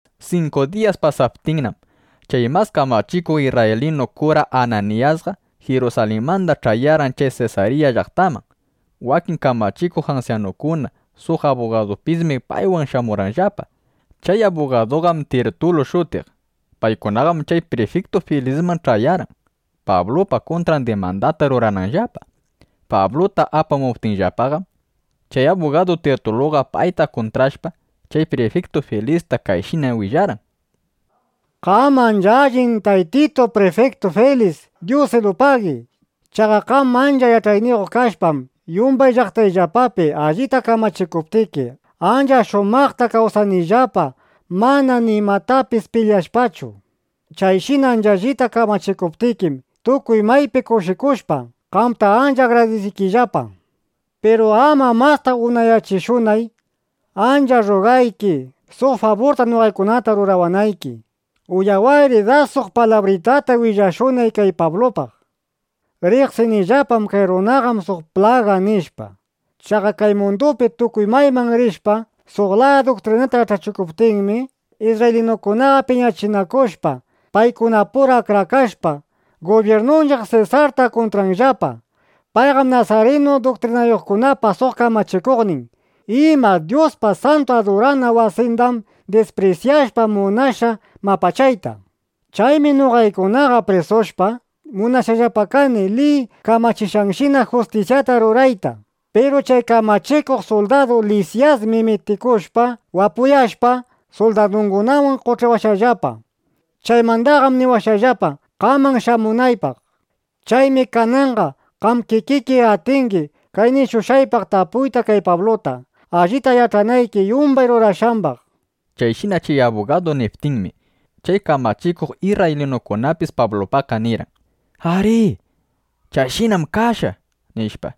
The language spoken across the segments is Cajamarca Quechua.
Sinku diyas pasaptinnam, chay mas kamachikuq isrraylinu kura Ananiyasqa Jirusalinmanda ch'ayarqan chay Sesarya llaqtaman. Wakin kamachikuq ansyanukuna suq abugadupismi paywan shamurqanllapa. Chay abugaduqam Tirtulu shutiq. Paykunaqam chay prifiktu Filisman ch'ayarqan, Pablupa kuntran dimandata rurananllapa. Pabluta apamuptinllapaqam, chay abugadu Tirtuluqa payta kuntrashpa, chay prifiktu Filista kayshina willarqan: —Qam ancha allin Taytitu Prifiktu Filis, dyusilupagi. Chaqa qam ancha yach'ayniyuq kashpam, yumbay llaqtayllapapi allita kamachikuptiki, ancha shumaqta kawsanillapa, mana nimatapis pilyashpachu. Chayshina ancha allita kamachikuptikim, tukuy maypi kushikushpa, qamta ancha agradisiykillapa. Piru ama masta unayachishunay, ancha rrugayki suq faburta noqaykunata rurawanayki. Uyawayri das suq palabritata willashunay kay Pablupaq. ’Riqsinillapam: Kay runaqam suq plaga, nishpa. Chaqa kay mundupi tukuy mayman rishpa, suq laya duktrinata yach'achikuptinmi, isrraylinukunaqa piñachinakushpa, paykunapura akrakashpa, gubyirnunchiq Sesarta kuntranllapa. Payqam nasarinu duktrinayuqkunapa suq kamachikuqnin. ¡Ima! Dyuspa santu adurana wasindam disprisyashpa, munashqa mapachayta. ˻Chaymi noqaykunaqa prisushpa, munashqallapa kani liy kamachishqanshina justisyata rurayta. Piru chay kamachikuq suldadu Lisyasmi mitikushpa, wapuyashpa, suldadungunawan qoch'iwashqallapa. Chaymandaqam niwashqallapa, qaman shamunaypaq.˼ Chaymi kananqa qam kikiki atingi kay nishushqaypaq tapuyta kay Pabluta, allita yach'anayki yumbay rurashqambaq, nishpa. Chayshina chay abugadu niptinmi, chay kamachikuq isrraylinukunapis Pablupaqqa nirqan: —Arí, chayshinam kashqa, nishpa.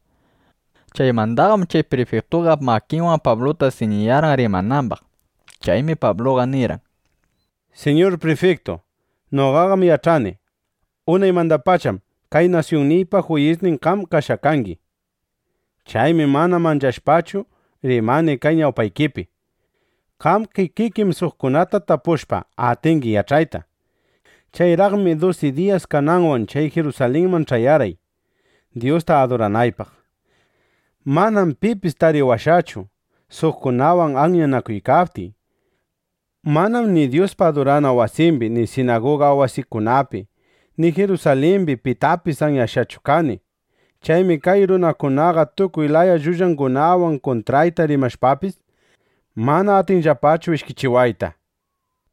Chaymandaqam chay prifiktuqa makinwan Pabluta siñiyarqan rimanambaq. Chaymi Pabluqa nirqan: —Siñur Prifiktu, noqaqam yach'ani: Unaymandapacham kay nasyunniypa juyisnin qam kashqa kangi. Chaymi mana manchashpachu, rimani kay ñawpaykipi. Qam kikikim suqkunata tapushpa, atingi yach'ayta. Chayraqmi dusi diyas kananwan chay Jirusalinman ch'ayarqay, Dyusta aduranaypaq. Manam pipis tariwashqachu, suqkunawan anyanakuykaptiy. Manam ni Dyuspa adurana wasimbi ni sinaguga wasikunapi, ni Jirusalimbi pitapis anyashqachu kani. Chaymi kay runakunaqa tukuy laya llullangunawan kuntrayta rimashpapis, mana atinllapachu ishkichiwayta.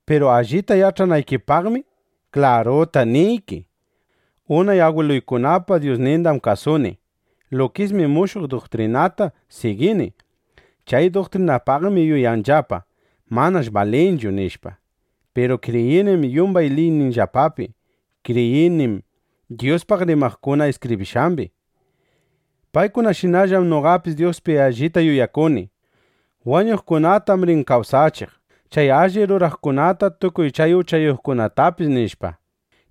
Piru allita yach'anaykipaqmi, klaruta niyki, unay agwiluykunapa Dyusnindam kasuni. Lukismi mushuq duktrinata sigini. Chay duktrinaypaqmi yuyanllapa: Manash balinchu, nishpa. Piru kriyinim yumbay liyninllapapi. Kriyinim Dyuspaq rimaqkuna iskibrishqambi. Paykunashinallam noqapis Dyuspi allita yuyakuni: Wañuqkunatam rin kawsachiq, chay alli ruraqkunata tukuy chay uchayuqkunatapis, nishpa.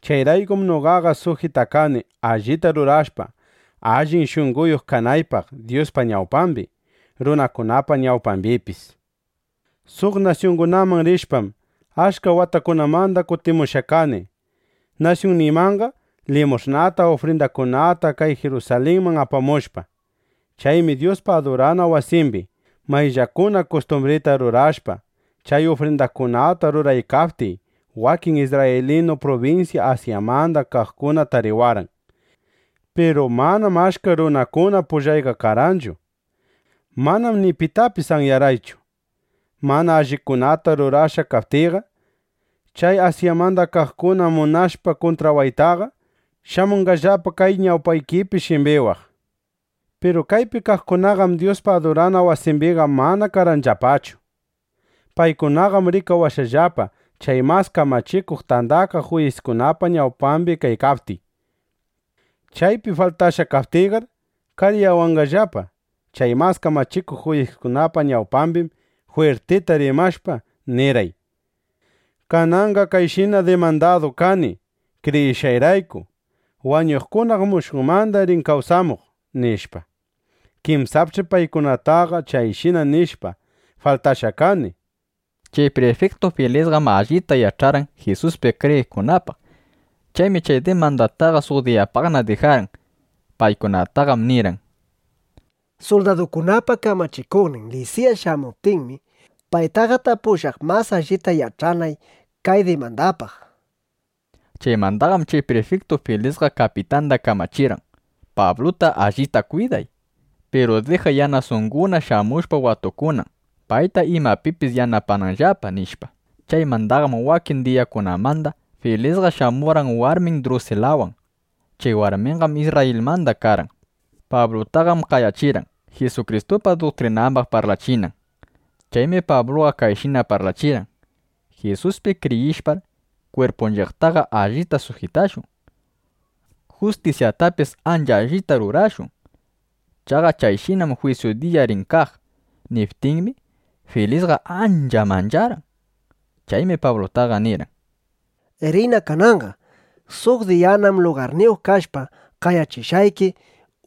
Chayraykum noqaqa sujitakani, allita rurashpa, allin shunqoyuq kanaypaq Dyuspa ñawpambi, runakunapa ñawpambipis. ’Suq nasyungunaman rishpam, achka watakunamanda kutimushqa kani nasyunniymanqa, limush'nata, ufrindakunata kay Jirusalinman apamushpa. Chaymi Dyuspa adurana wasimbi mayllakuna kustumbrita rurashpa, chay ufrindakunata ruraykaptiy, wakin isrraylinu prubinsya Asyamanda kaqkuna tariwarqan. Piru manam achka runakuna pullayqa karqanchu. Manam ni pitapis anyarqaychu. Mana allikunata rurashqa kaptiyqa, chay Asyamanda kaqkuna munashpa kuntrawaytaqa, shamunqallapa kay ñawpaykipi shimbiwaq. Piru kaypi kaqkunaqam Dyuspa adurana wasimbiqa mana karqanllapachu. Paykunaqam rikawashqallapa chay Mas Kamachikuq Tandakaq Juyiskunapa ñawpambi kaykaptiy. Chaypi faltashqa kaptiyqar, kariyawanqallapa. Chay mas kamachikuq juyiskunapa ñawpambim jwirtita rimashpa, nirqay: “Kananqam kayshina dimandadu kani, kriyishqayrayku: Wañuqkunam mushuqmanda rin kawsamuq”, nishpa. Kinsapch'i paykunataqa chayshina nishpa faltashqa kani, nishpa. Chay prifiktu Filisqam allita yach'arqan Jisuspi kriyiqkunapaq. Chaymi chay dimandataqa suq diyapaqna dijarqan. Paykunataqam nirqan: —Suldadukunapa kamachikuqnin Lisyas shamuptinmi, paytaqa tapushaq, mas allita yach'anay kay dimandapaq, nishpa. Chaymandaqam chay prifiktu Filisqa kapitanda kamachirqan: —Pabluta allita kwiday. Piru dijay, yanasunguna (yanasanguna) shamushpa watukunan, payta imapipis yanapananllapa, nishpa. Chaymandaqam wakin diyakunamanda Filisqa shamurqan warmin Drusilawan. Chay warminqam Isrrayilmanda karqan. Pablutaqam qayachirqan, Jisukristupa duktrinambaq parlachinan. Chaymi Pabluqa kayshina parlachirqan: “Jisuspi kriyishpar, kwirpunchiqtaqa allita sujitashun. Justisyatapis ancha allita rurashun. Chaqa kayshinam jwisyu diya rin kaq”, niptinmi, Filisqa ancha mancharqan. Chaymi Pablutaqa nirqan: —Riyna kananqa. Suq diyanam lugarniyuq kashpa, qayachishqayki uyashunaqpaq,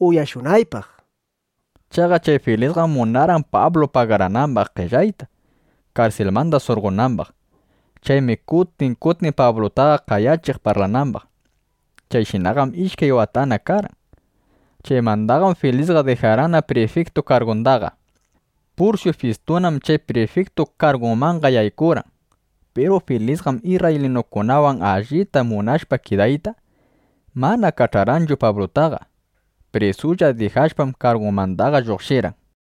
nishpa. Chaqa chay Filisqam munarqan Pablu pagaranambaq qellayta, karsilmanda surqonambaq. Chaymi kutin kutin Pablutaqa qayachiq parlanambaq. Chayshinaqam ishkay watana karqan. Chaymandaqam Filisqa dijarqanna prifiktu kargundaqa. Pursyu Fistunam chay prifiktu kargunmanqa yaykurqan. Piru Filisqam isrraylinukunawan allita munashpa kidayta, mana kach'arqanchu Pablutaqa. Prisulla dijashpam, kargunmandaqa lluqshirqan.